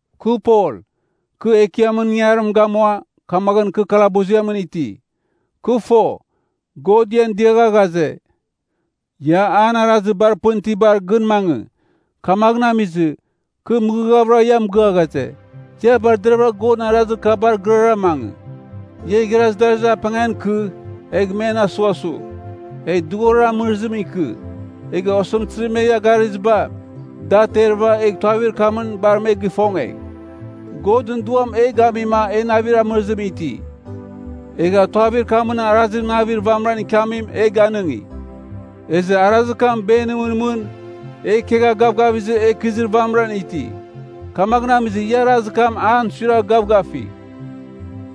Kɨ Pol, kɨ Ekiamɨn ingarim gamua, kamaghɨn kɨ kalabuziamɨn iti. Kɨ fo, God ian dɨagha ghaze, ia an arazir bar pɨn itibar gɨn mangɨ. Kamaghɨn amizɨ, kɨ mɨghɨghavɨra ia mɨgɨa ghaze, ia bar deraghvɨra Godɨn arazir kabar gɨrara mangɨ. Ia igharaz darazir apengan ikɨ, egh men asughasugh, egh dughorir amɨrɨzimɨn ikɨ, egh osɨmtɨzir me ia garɨziba, da aterɨva, egh tuavir kamɨn bar me gifongegh. Godɨn Duam e gamima e navir amɨrɨzim iti. Egha tuavir kamɨn arazir navir vamɨran ikiamim e ganɨngi. Ezɨ arazir kam benimɨn mɨn e ikegha gavgavizɨ e ikɨzir vamɨran iti. Kamaghɨn amizɨ ia arazir kam an suiragh gavgafigh.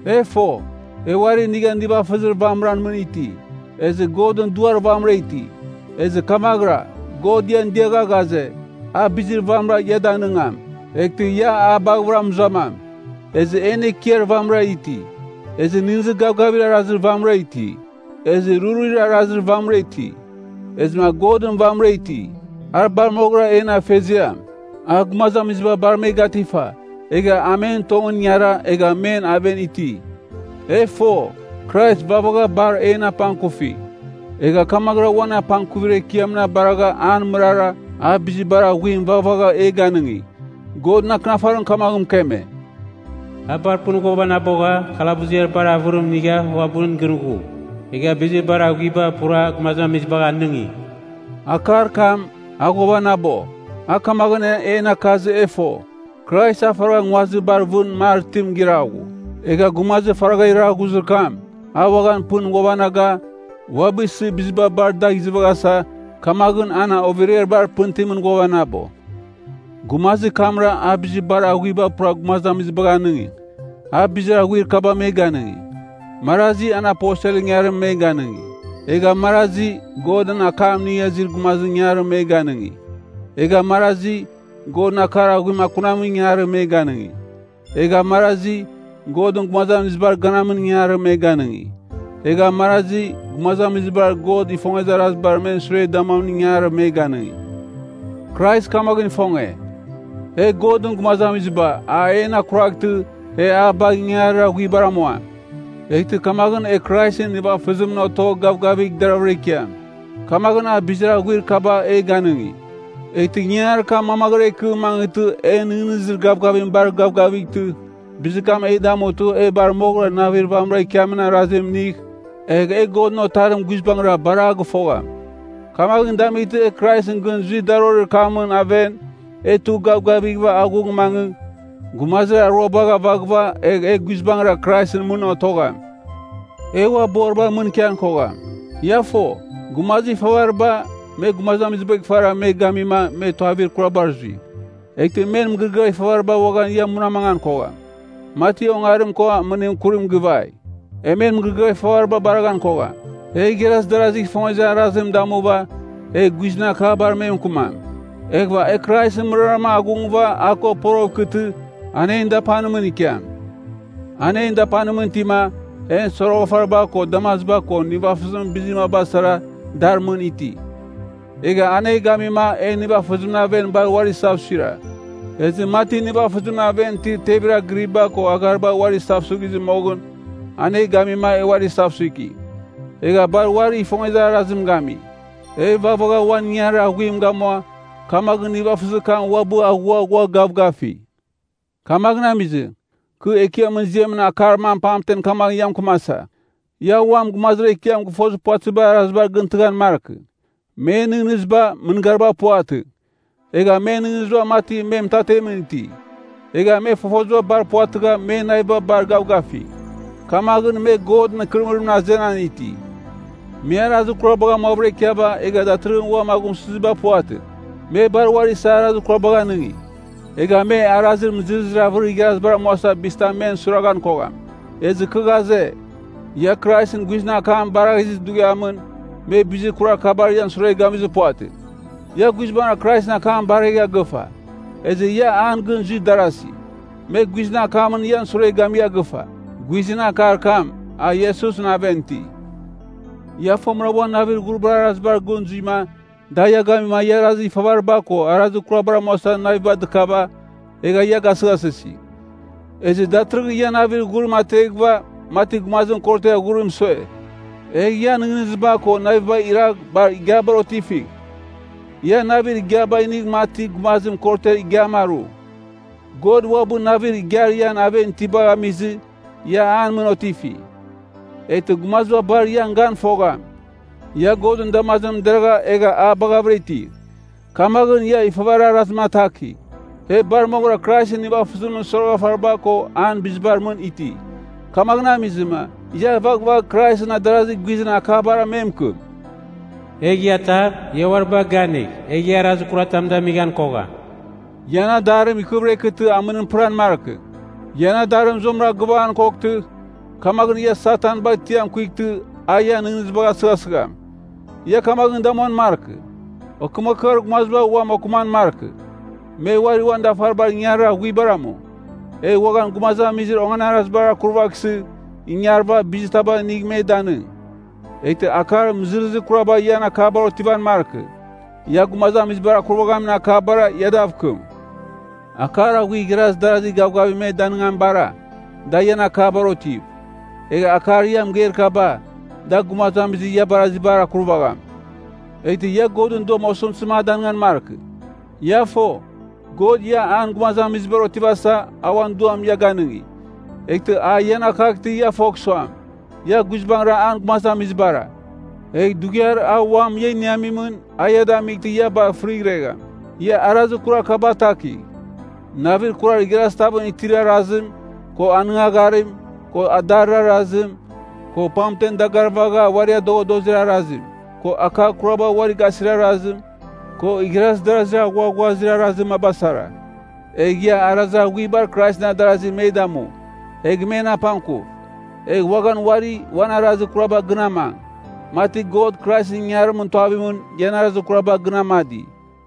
E fo, e uari inigha nivafɨzir vamɨran mɨn iti. Ezɨ Godɨn Duar vamɨra iti. Ezɨ kamaghɨra, God ian diagha ghaze, a bizir vamɨra ia a danɨngam, eghtɨ ia a baghɨvɨra mɨzuamam. Ezɨ en Ekiar vamɨra iti. Ezɨ nɨghnɨzir gavgavir arazir vamɨra iti. Ezɨ rurir arazir vamɨra iti. Ezɨma Godɨn vamɨra iti. A bar moghɨram en Afeziam. A gumazamiziba bar me gatifa, egha a men tongɨn ingara egha men aven iti. E fo, Krais vaghvagha bar en apangkufi. Egha kamaghɨra uan apangkuvir ekiamɨn abaragha an mɨrara, a bizir bar aghuim vaghvagha e ganɨngi. Godɨn Akɨnafarim kamaghɨn mɨkeme, “A bar pɨn ghuavanabogha, kalabuziar bar avɨrim inigha uabɨn gɨn ghu. Egha bizir bar aghuiba pura gumazamizibagh anɨngi.” Akar kam, “A ghuavanabo,” a kamaghɨn en akazɨ e fo, Krais a faragha nguazir bar vɨn mar itim giraghu. Egha gumazir faragha iraghuzir kam, a uaghan pɨn ghuavanaga, uabɨ isɨ biziba bar dagh izɨvaghasa, kamaghɨn an overiar bar pɨn itimɨn ghuavanabo. Gumazir kamra a “bizir bar aghuiba pura gumazamizibagh anɨngi.” A bizir aghuir kaba me ganɨngi, marazi an aposelɨn ingangarim me ganɨngi. Egha marazi, Godɨn akam inigha izir gumazimɨn ingangarim me ganɨngi. Egha marazi, Godɨn akar aghuim akunamin ingangarim me ganɨngi, egha marazi, Godɨn gumazamizibar ganamin ingangarim me ganɨngi, egha marazi, gumazamizibar God ifongezir arazibar men sure damuamin ingangarim me ganɨngi. Krais kamaghɨn ifonge, e Godɨn gumazamiziba a en akuraghtɨ e a bagh ingangarir aghuibar amuam. Eghtɨ kamaghɨn e Kraisɨn nivafɨzimɨn otogh gavgavigh deravɨra ikiam. Kamaghɨn a bizir aghuir kaba e ganɨngi. Eghtɨ ingangarir kam mamaghɨra ikɨ mangɨtɨ en nɨghnɨzir gavgavim bar gavgavightɨ bizir kam e damutɨ e bar moghɨra navir vamɨra ikiamin arazim inigh, egh e Godɨn Otarim guizbangɨra bar a gɨfogham. Kamaghɨn damightɨ e Kraisɨn gɨn zuir darorir kamɨn aven, e tugh gavgavighɨva aghung mangɨ, gumazir aruabar avaghɨva egh e guizbangɨra Kraisɨn mɨn otogham. E ua boribar mɨn ikian kogham. Ia fo, gumazir ifavariba, me gumazibagh ifara me gamima me tuavir kurabar zui. Eghtɨ men mɨgɨrɨgɨar ifavariba uaghan ia munamangan kogham, mati ongarim ko amɨnim kurim givai. E men mɨgɨrɨgɨar ifavariba baraghan kogham. E igharaz darazigh ifongezir arazim damuva egh guizɨn akabar me mɨkɨmam. Eghɨva e Kraisɨn mɨrara aghungɨva a ko poroghɨv ikɨtɨ an en dapanimɨn ikiam. A en dapanimɨn itima en soroghafariba ko damaziba ko nivafɨzimɨn bizir maba sara dar mɨn iti. Egha an e gamima e nivafɨzimɨn aven bar uari isavsuira. Ezɨ mati nivafɨzimɨn aven itir tevir agɨriba ko aghariba uari isavsuighizɨ moghɨn, an e gamima e uari isavsuiki, egha bar uarigh ifongezir arazim gami. E vaghvagha uan ingangarir aghuim gamua, kamaghɨn nivafɨzir kam uabɨ aghua ghua gavgafi. Kamaghɨn amizɨ, kɨ Ekiamɨn ziamɨn akar mam pamtem kamaghɨn ia mɨkɨmasa. Ia uam gumazir Ekiam gɨfozir puvatɨzibar arazibar gɨntɨghan markɨ. Men nɨghnɨziba, mɨngariba puvatɨ. Egha men nɨghnɨziba mati me mɨtatemɨn iti. Egha me fofoziba bar puvatɨgha men naviba bar gavgafi, kamaghɨn me Godɨn ikɨrɨmɨrimɨn azenan iti. Me arazir kurabagh amuavɨra ikiava egha datɨrɨghɨn uam aghumsɨziba puvatɨ. Me bar uari isa arazir kurabagh anɨngi, egha me arazir mɨzɨrɨzir avɨrir igharazibar amusɨ bizitam men suiraghan kogham. Ezɨ kɨ ghaze, ia Kraisɨn guizɨn akam baraghizir dughiamɨn, me bizir kurar kabar ian sure gamizir puvatɨ. Ia guizbangɨra Kraisɨn akam baregha gɨfa. Ezɨ ia an gɨn zuir darasi, me guizɨn akamɨn ian sure gamigha gɨfa. Guizɨn akar kam, a Iesusɨn aven iti. Ia fomɨra uan navir ghuribar arazibar gɨn zuima da ia gamima ia arazir ifavariba ko arazir kurabar amuasa navim dɨkava, egha ia gasɨghasɨsi. Ezɨ datɨrɨghɨn ia navir ghurim ateghɨva mati gumazim korotiar ghurim sue. Egh ian nɨghnɨziba ko navibagh iragha bar igiabar otifigh. Ia navir igiaba inigh mati gumazim korotiar igiam aru. God uabɨ navir igiar ian aven itibagh amizɨ ia an mɨn otifi. Eghtɨ gumaziba bar ian gan fogham, ia Godɨn damazimɨn deragha egha a baghavɨra iti. Kamaghɨn ia ifavarir arazim atakigh. E bar moghɨra Kraisɨn nivafɨzimɨn soroghafariba ko an bizibar mɨn iti. Kamaghɨn amizɨma, ia vaghvagh Kraisɨn adarazi guizɨn akabara me mɨkɨm. Egh ia atar, ia uaribagh ganigh, egh ia arazir kuratam damighan kogham. Ian adarim ikɨvɨra ikɨtɨ amɨnim pɨran markɨ. Ian adarim zuamɨra gɨvaghan koghtɨ, kamaghɨn ia Satan bagh tiam kuightɨ a ian nɨghnɨzibagh asɨghasɨgham. Ia kamaghɨn damuan markɨ. Okɨmakɨar gumaziba uam okɨman markɨ. Me uari uan dafaribar ingangarir aghuibar amu. Egh uaghan gumazamizir onganarazibar akurvaghsɨ, ingarɨva bizir taba inigh me danɨng. Eghtɨ akar mɨzɨrɨzir kuraba ian akabar otivan markɨ. Ia gumazamizibar akurvaghamin akabara ia dav kɨm. Akar aghuir igharaz darazi gavgavim me danɨngamibara, dar ian akabar otiv. Egh akar ia mɨgeir kaba, da gumazamizir ia barazibar akurvagham. Eghtɨ ia Godɨn Duam osɨmtɨzim a danɨngan markɨ. Ia fo, God ia an gumazamizibar otivasa, a uan Duam ia ganɨngi. Eghtɨ a ian akaghtɨ ia fogh suam, ia guizbangɨra an gumazamizibara, egh dughiar a uam ia iniamimɨn a ia damightɨ ia bar fɨrighregham. Ia arazir kurar kaba atakigh: navir kurar igharazi tavɨn itir arazim, ko anɨngagharim, ko adarir arazim, ko pamtem dagarvagha uari adoghadozir arazim, ko akar kuraba uari gasir arazim, ko igharaz darazir aghuaghuazir arazir maba sara. Egh ia arazir aghuibar Kraisɨn adarasi me damu, egh men apangkuv. Egh uaghan uari uan arazir kuraba gɨn amang, mati God Kraisɨn ingangarimɨn tuavimɨn, ian arazir kuraba gɨn amadi.